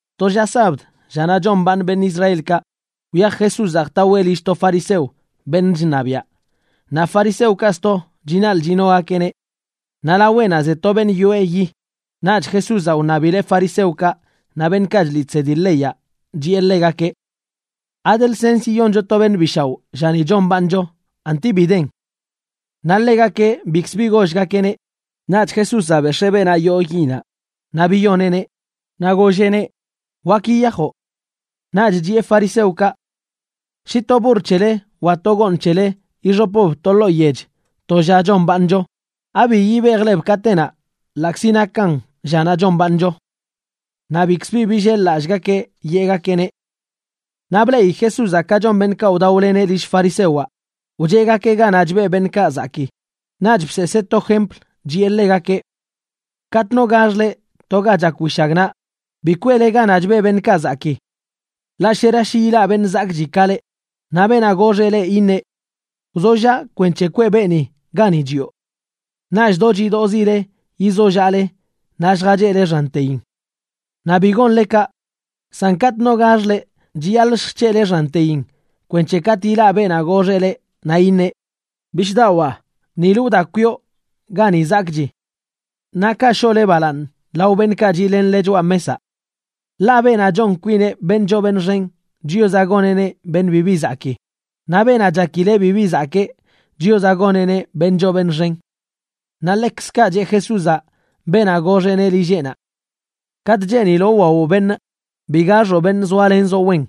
To lla sabd, llanaꞌ chombaaṉ beṉꞌ Israelkaꞌ, wyaj Jesúzaꞌ jtaweꞌ lill to fariseo, beṉꞌ chṉabiaꞌ, naꞌ fariseokaꞌ sto chinaḻꞌ chinogakeꞌneꞌ. Naꞌ laweꞌnaꞌ ze to beṉꞌ yoꞌe yi. Naꞌch Jesúzaꞌ wṉabileꞌ fariseokaꞌ naꞌ beṉꞌkaꞌ chliꞌ chsedi leyaꞌ, chiꞌe ḻegakeꞌ: ―¿Ade lsens yiyoncho to beṉꞌ bi shaoꞌ llani chombaaṉcho, anti bi den? Naꞌ ḻegakeꞌ bikzə bi gollgakeꞌneꞌ. Naꞌch Jesúzaꞌ bex̱ee beenaꞌ yoo yinaꞌ naꞌ biyoneꞌneꞌ, naꞌ golleꞌneꞌ: ―Wak yiyajoꞌ. Naꞌch chiꞌe fariseokaꞌ: ―Shi to burr c̱hele wa to gooṉ c̱hele ixopb to ḻoo yech to lla chombaaṉcho, ¿abi yibejleb katenaꞌ ḻaꞌkzi nakan llanaꞌ chombaaṉcho? Naꞌ bikz bi billel-lallꞌgakeꞌ yeꞌgakeꞌneꞌ. Naꞌ bleꞌi Jesúzaꞌ ka chon beṉꞌkaꞌ wdaoleneꞌ lill farisewaꞌ, wcheꞌgakeꞌ ganaꞌ chbeꞌ beṉꞌkaꞌ zakii. Naꞌch bseesee to jempl, chiꞌe ḻegakeꞌ: ―Katꞌ no gax leꞌ to ga chak wishagnaꞌ, bi kweꞌle ganaꞌ chbeꞌ beṉꞌkaꞌ zakii. Ḻaꞌ shera shi ilaꞌ beṉꞌ zakꞌchi ka leꞌ, naꞌ beenaꞌ goxeꞌ leꞌ iṉeꞌ: “Wzollaꞌ kwenc̱he kweꞌ beeni gani chiꞌo.” Naꞌch do chidoꞌzile yizollaꞌle naꞌ lljacheꞌle xanteyin. Naꞌ bi gonle kaꞌ. San katꞌ no gax leꞌ, chiyaḻꞌ lljc̱heꞌle xanteyin kwenc̱he katꞌ ilaꞌ beenaꞌ goxeꞌ leꞌ naꞌ iṉeꞌ: “Bishꞌdawaa, nilə wda kwiꞌo gani zakꞌchi.” Naꞌ kaꞌ shoꞌle balaaṉ lao beṉꞌkaꞌ chiꞌlenle choꞌa mesaꞌ. Ḻaꞌ beenaꞌ chon kwineꞌ beṉꞌ choo beṉꞌ xen, Chiozaꞌ goneꞌneꞌ beṉꞌ bibi zakii; naꞌ beenaꞌ chakileꞌ bibi zakee, Chiozaꞌ goneꞌneꞌ beṉꞌ choo beṉꞌ xen. Naꞌ ḻekzkaꞌ cheꞌ Jesúzaꞌ beenaꞌ goxeꞌneꞌ lilleꞌnaꞌ: ―Katꞌ cheeniloꞌ wwawoꞌ beṉꞌ, bi gaxoꞌ beṉꞌ zoalenzoꞌ wen,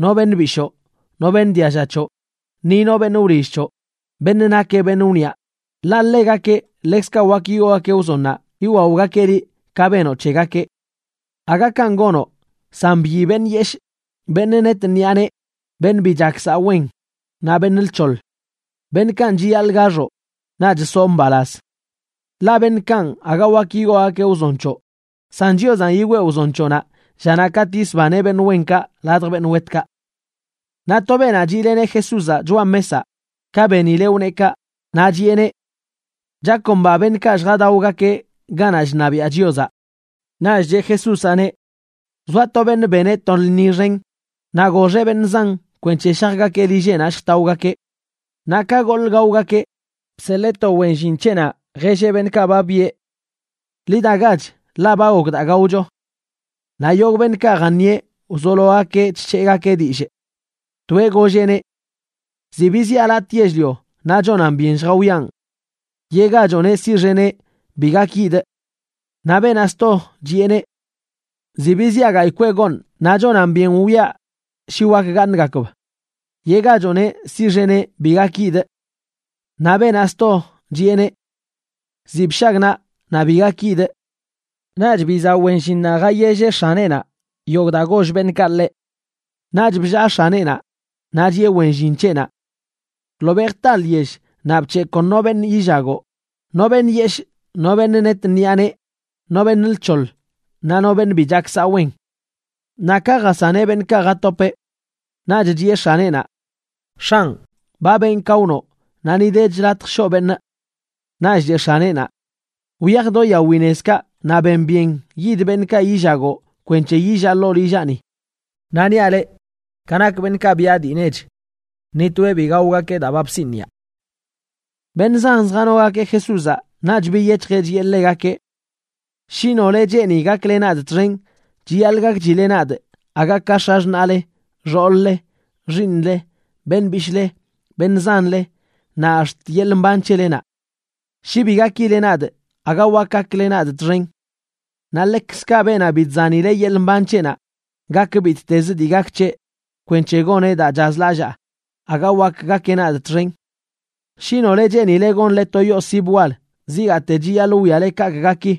no beṉꞌ bishoo, no beṉꞌ dialla c̱hoꞌ, ni no beṉꞌ wlill c̱hoꞌ, beṉꞌ nakeꞌ beṉꞌ wniꞌa, ḻaꞌ ḻegakeꞌ ḻekzkaꞌ wak yigoogakeꞌ wzonnaꞌ yiwaogakeꞌ liꞌ ka benoꞌ c̱hegakeꞌ. Aga kanꞌ gonoꞌ, san byi beṉꞌ yeshꞌ, beṉꞌ net ṉiꞌa nee, beṉꞌ bi chak saꞌ wen naꞌ beṉꞌ lc̱hoḻ. Beṉꞌkanꞌ chiyaḻꞌ gaxoꞌ, naꞌch soꞌ mbalaz. Ḻaꞌ beṉꞌkanꞌ aga wak yigoogakeꞌ wzon c̱hoꞌ, san Chiozanꞌ yigwee wzon c̱hoꞌnaꞌ llanaꞌ katꞌ yisbaneꞌ beṉꞌ wenkaꞌ ladj beṉꞌ wetkaꞌ. Naꞌ to beenaꞌ chiꞌleneꞌ Jesúzaꞌ choꞌa mesaꞌ, ka benileꞌ wneꞌ kaꞌ, naꞌ chiꞌeneꞌ: ―¡Chakomba beṉꞌkaꞌ lljadaogakeꞌ ganaꞌ chṉabiaꞌ Chiozaꞌ! Naꞌch cheꞌ Jesúzaꞌneꞌ: ―Wzoa to beṉꞌ beneꞌ to lṉi xen, naꞌ goxeꞌ beṉꞌ zan kwenc̱he shajgakeꞌ lilleꞌnaꞌ lljtaogakeꞌ. Naꞌ ka goḻꞌ gaogakeꞌ, bseḻee to wen llin c̱heꞌnaꞌ jelleꞌ beṉꞌkaꞌ ba byeꞌ: “Ḻi dagach, ḻaꞌ ba gok daa gaocho.” Naꞌ yogꞌ beṉꞌkaꞌ jaṉieꞌ wzologakeꞌ chc̱heꞌgakeꞌ dillꞌ. Toeꞌ golleꞌneꞌ: “Ziꞌ biziꞌa latꞌ yell-lio naꞌ chonan byen lljawiaꞌn. Yeꞌgachoꞌneꞌ siꞌxeneꞌ bi gak yidꞌ.” Naꞌ beenaꞌ sto chiꞌeneꞌ: “Ziꞌ biziꞌa gayꞌ kweꞌ gooṉ naꞌ chonan byen wwiaꞌ shi wak gaaṉgakb. Yeꞌgachoꞌneꞌ siꞌxeneꞌ bi gak yidꞌ.” Naꞌ beenaꞌ sto chiꞌeneꞌ: “Ziꞌ bshagnaꞌ, naꞌ bi gak yidꞌ.” Naꞌch bizaꞌ wen llinnaꞌ jayelleꞌ x̱aneꞌnaꞌ yogꞌ daa goll beṉꞌkaꞌ ḻeꞌ. Naꞌch bllaa x̱aneꞌnaꞌ naꞌ chiꞌe wen llin c̱heꞌnaꞌ: “Ḻobeꞌ jta lyell naꞌ bc̱heꞌ kon no beṉꞌ yillagoꞌ, no beṉꞌ yeshꞌ, no beṉꞌ net ṉiꞌa nee, no beṉꞌ lc̱hoḻ, naꞌ no beṉꞌ bi chak saꞌ wen.” Naꞌ ka jasaneꞌ beṉꞌkaꞌ jatopeꞌ, naꞌch chiꞌe x̱aneꞌnaꞌ: “X̱anꞌ, ba benꞌ ka wnoꞌ, naꞌ ni dech latj shoꞌ beṉꞌ.” Naꞌch cheꞌ x̱aneꞌnaꞌ: “Wyaj do yawi nezkaꞌ naꞌ ben byen yid beṉꞌkaꞌ yillagoꞌ kwenc̱he yillaꞌ ḻoo lillaꞌni. Naꞌ niaꞌ leꞌ, ka nak beṉꞌkaꞌ byaꞌ dii nech, ni toeꞌ bi gaogakeꞌ daa ba bsiniꞌa.” Beṉꞌ zan zjanogakeꞌ Jesúzaꞌ, naꞌch biyec̱hjeꞌ chiꞌe ḻegakeꞌ: ―Shi nole cheeni gakle nadꞌ txen, chiyaḻꞌ gakchile nadꞌ aga ka x̱axṉaꞌle, xool-le, xiiṉle, beṉꞌ bishꞌle, beṉꞌ zanle, naꞌ ax̱t yeḻꞌ mban c̱helenaꞌ. Shi bi gakileꞌ nadꞌ, aga wak gakle nadꞌ txen. Naꞌ ḻekzkaꞌ beenaꞌ bi chzanileꞌ yeḻꞌ mban c̱heꞌnaꞌ, gak bittezə dii gak c̱heꞌ, kwenc̱he goneꞌ daa chazlallaa, aga wak gakeꞌ nadꞌ txen. Shi nole cheenile gonle to yoo sib wal, zigaate chiyaḻꞌ wwiale kaꞌkꞌ gaki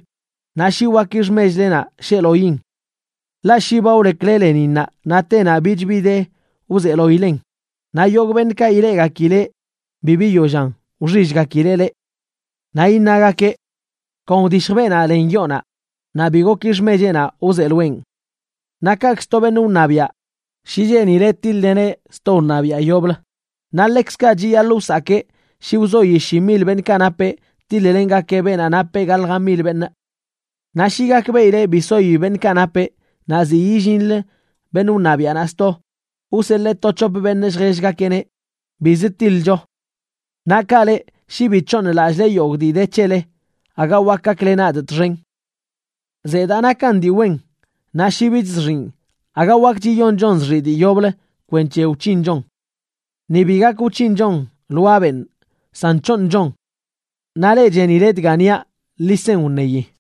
naꞌ shi waki xmechlenaꞌ sheeloin. Ḻaꞌ shi ba wlekwle leninnaꞌ naꞌ tenaꞌ bich bi de wzeeloilen, naꞌ yogꞌ beṉꞌkaꞌ ileꞌgakileꞌ bi biyollan wxillgakileꞌ leꞌ. Naꞌ iṉagakeꞌ: “Kon wdishj beenaꞌ len yoonaꞌ naꞌ bi goki xmecheꞌnaꞌ wzeeloeꞌn.” Naꞌ kaꞌkz to beṉꞌ wṉabiaꞌ, shi cheenileꞌ tiḻ-leneꞌ sto wṉabiaꞌ yoblə, naꞌ ḻekzkaꞌ chiyaḻꞌ wsakee shi wzoi shi mil beṉꞌkaꞌ napeꞌ tiḻ-lengakeꞌ beenaꞌ nap gaḻja mil beṉꞌ. Naꞌ shi gakbeꞌileꞌ bi soi beṉꞌkaꞌ napeꞌ, naꞌ ziꞌ illinlə beṉꞌ wṉabiaꞌnaꞌ sto, wseḻee to c̱hop beṉꞌ lljellgakeꞌneꞌ: “Bizə tiḻcho.” Naꞌ kaꞌ leꞌ, shi bi c̱hooṉlallꞌle yogꞌ dii de c̱hele, aga wakə gakle nadꞌ txen. ’Zedaa nakan dii wen, naꞌ shi bich zxiꞌn aga wakch yiyonchon zxiꞌ dii yoblə kwenc̱he wc̱hinchon. Ni bi gak wc̱hinchon lwaa benꞌ, san c̱hooṉchon. Naꞌ leꞌ chenile dga niaꞌ, ḻi sen wṉeyi.